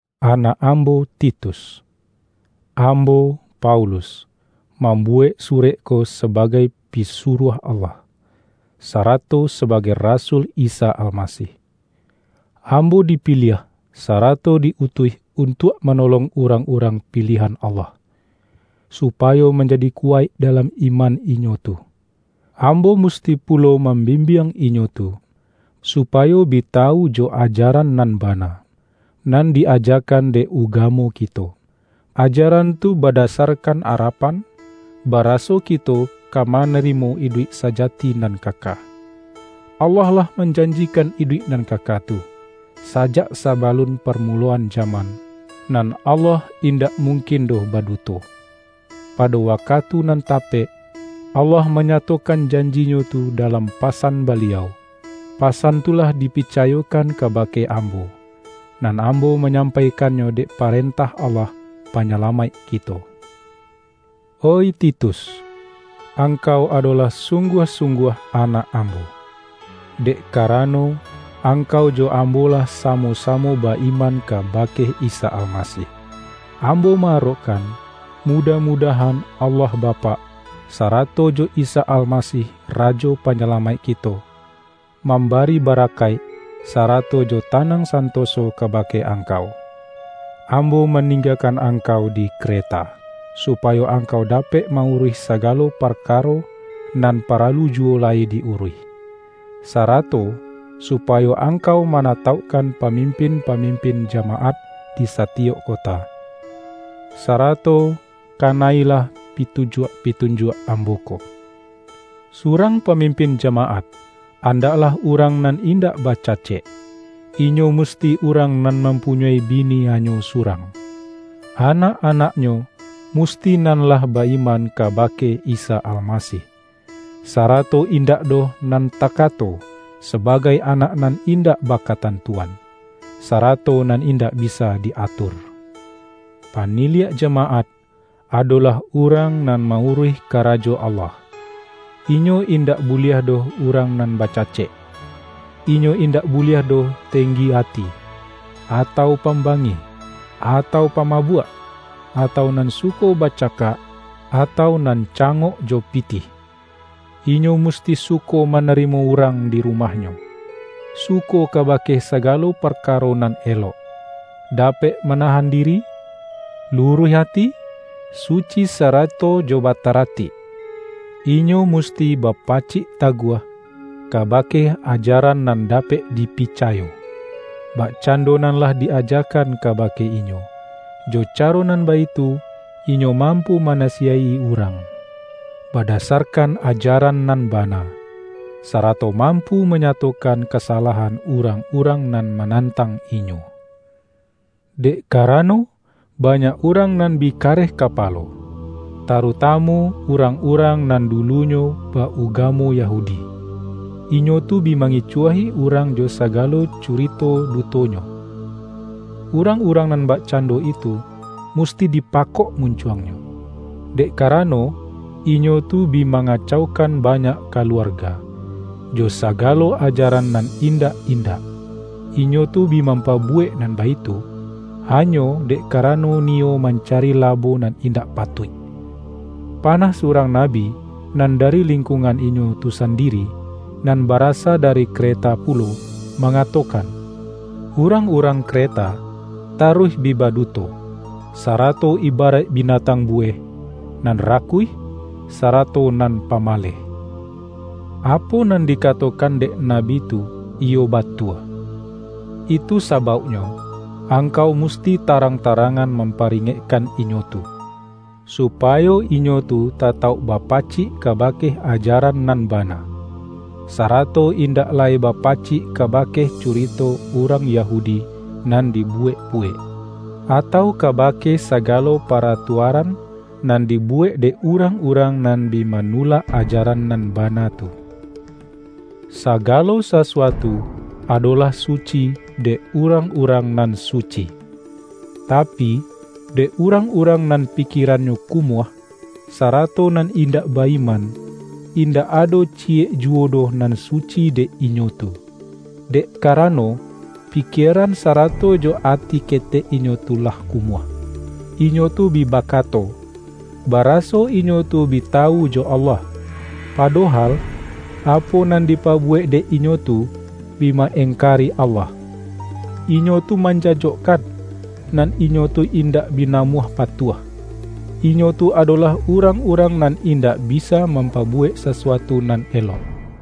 Anak ambo Titus! Ambo, Paulus, mambuwek surek ko sabagai pi-suruah Allah, sarato sabagai rasul Isa Almasih. Ambo dipiliah, sarato di-utuih untuak manolong urang-urang piliahan Allah, supayo manjadi ku-waik dalam iman inyo tu. Ambo musti pulo mambimbiang inyo tu, supayo bi tawu jo ajaran nan bana, nan di-aja-kan dek ugamo kito. Ajaran tu bada-sarkan arapan, baraso kito ka mana-rimo iduik sajati nan kaka. Allah lah manjanjikan iduik nan kaka tu, sajak sabalun parmuloan jaman — nan Allah indak mungkin doh baduto. Pado wakatu nan tapek, Allah manyatokan janji-Nyo tu dalam pasan Baliau. Pa-san tu lah dipicayokan kabake ambo, nan ambo manyampaikannyo dek pa-rentah Allah Panyalamaik kito. Oih Titus, angkau adolah sung-guah-sungguah anak ambo, dek ka-rano, angkau jo ambo lah samo-samo ba-iman kabake Isa Almasih. Ambo ma-arokkan, mudah-mudah-an Allah Bapak, sarato jo Isa Almasih Rajo Panyalamaik kito, mambari ba-rakaik, sarato jo tanang santoso ka-bake angkau. Ambo maninggakan angkau di Kre-ta, supayo angkau dapek ma-uruih sagalo parkaro nan paralu juwo lai di-uruih. Sarato supayo angkau mana-taukkan pamimpin-pamimpin jamaat di satiyok kota. Sarato kana-ilah pitun-juak-pitunjuak ambo ko: Surang pa-mimpin jamaat andaklah urang nan indak bacacek; inyo musti urang nan mampunyoi bini hanyo surang; anak-anaknyo musti nan lah ba-iman kaba-ke Isa Almasih, sarato indak doh nan takato sabagai anak nan indak baka-tantuan, sarato nan indak bisa di-atur. Paniliak jamaat, adolah urang nan ma-uruih karajo Allah, inyo indak bu-liah doh urang nan bacacek. Inyo in-dak buliah doh tenggi ati, atau pam-bangih, atau pamabuak, atau nan suko bacakak, atau nan cangok jo pi-tih. Inyo musti suko manarimo urang di rumahnyo, suko kabake sagalo par-karo nan elok, dapek manahan diri, lu-ruih ati, suci sarato jo bataratik. Inyo musti bapacik taguah kabake ajaran nan dapek dipicayo, bakcando nan lah di-ajakan kabake inyo. Jo caro nan baitu inyo mampu manasiyaik-i urang, badasarkan ajaran nan bana, sarato mampu manyatokan kasalahan urang-urang nan manantang inyo. Dek karano, banyak urang nan bi kareh kapalo, tarutamu urang-urang nan dulunyo ba-ugamo Yahudi; inyo tu bi mangicuahi urang jo sagalo curito du-tonyo. Urang-urang nan bakcando itu musti dipakok muncuangnyo, dek ka-rano, inyo tu bi mangacaukan banyak kaluarga, jo sagalo ajaran nan indak-in-dak. Inyo tu bi mampabuwek nan baitu, hanyo dek karano niyo mancari labo nan indak patuik! Panah surang na-bi nan dari lingkuangan inyo tu sandiri, nan barasa dari Kreta pulo, mangatokan,”Urang-urang Kreta taruih bi baduto, sarato ibaraik binatang buweh, nan ra-kuih, sarato nan pamaleh.” Apo nan dikatokan dek nabi tu iyo batua. Itu sa-bauknyo, angkau musti tarang-tarangan mamparingekkan inyo tu; supayo inyo tu tatauk bapacik kabake ajaran nan bana, sarato indak lai bapacik kabake curito urang Yahudi nan dibuwek-buwek, atau kabake sagalo paratuaran nan dibuwek dek urang-urang nan bi manulak ajaran nan bana tu. Sagalo sasuatu adolah suci dek urang-urang nan suci. Tapi, dek urang-urang nan pikierannyo kumuah, sarato nan indak ba-iman, indak ado ci-yek juwo doh nan suci dek inyo tu, dek karano, pikieran sarato jo ati ketek inyo tu lah kumuah! Inyo tu bi bakato, ba-raso inyo tu bi tawu jo Allah, padohal, apo nan dipabuwek dek inyo tu, bi ma-engkari Allah. Inyo tu manjajokkan, nan inyo tu indak bi namuah patuah; inyo tu adolah urang-urang nan indak bisa mampabuwek sasuatu nan elok.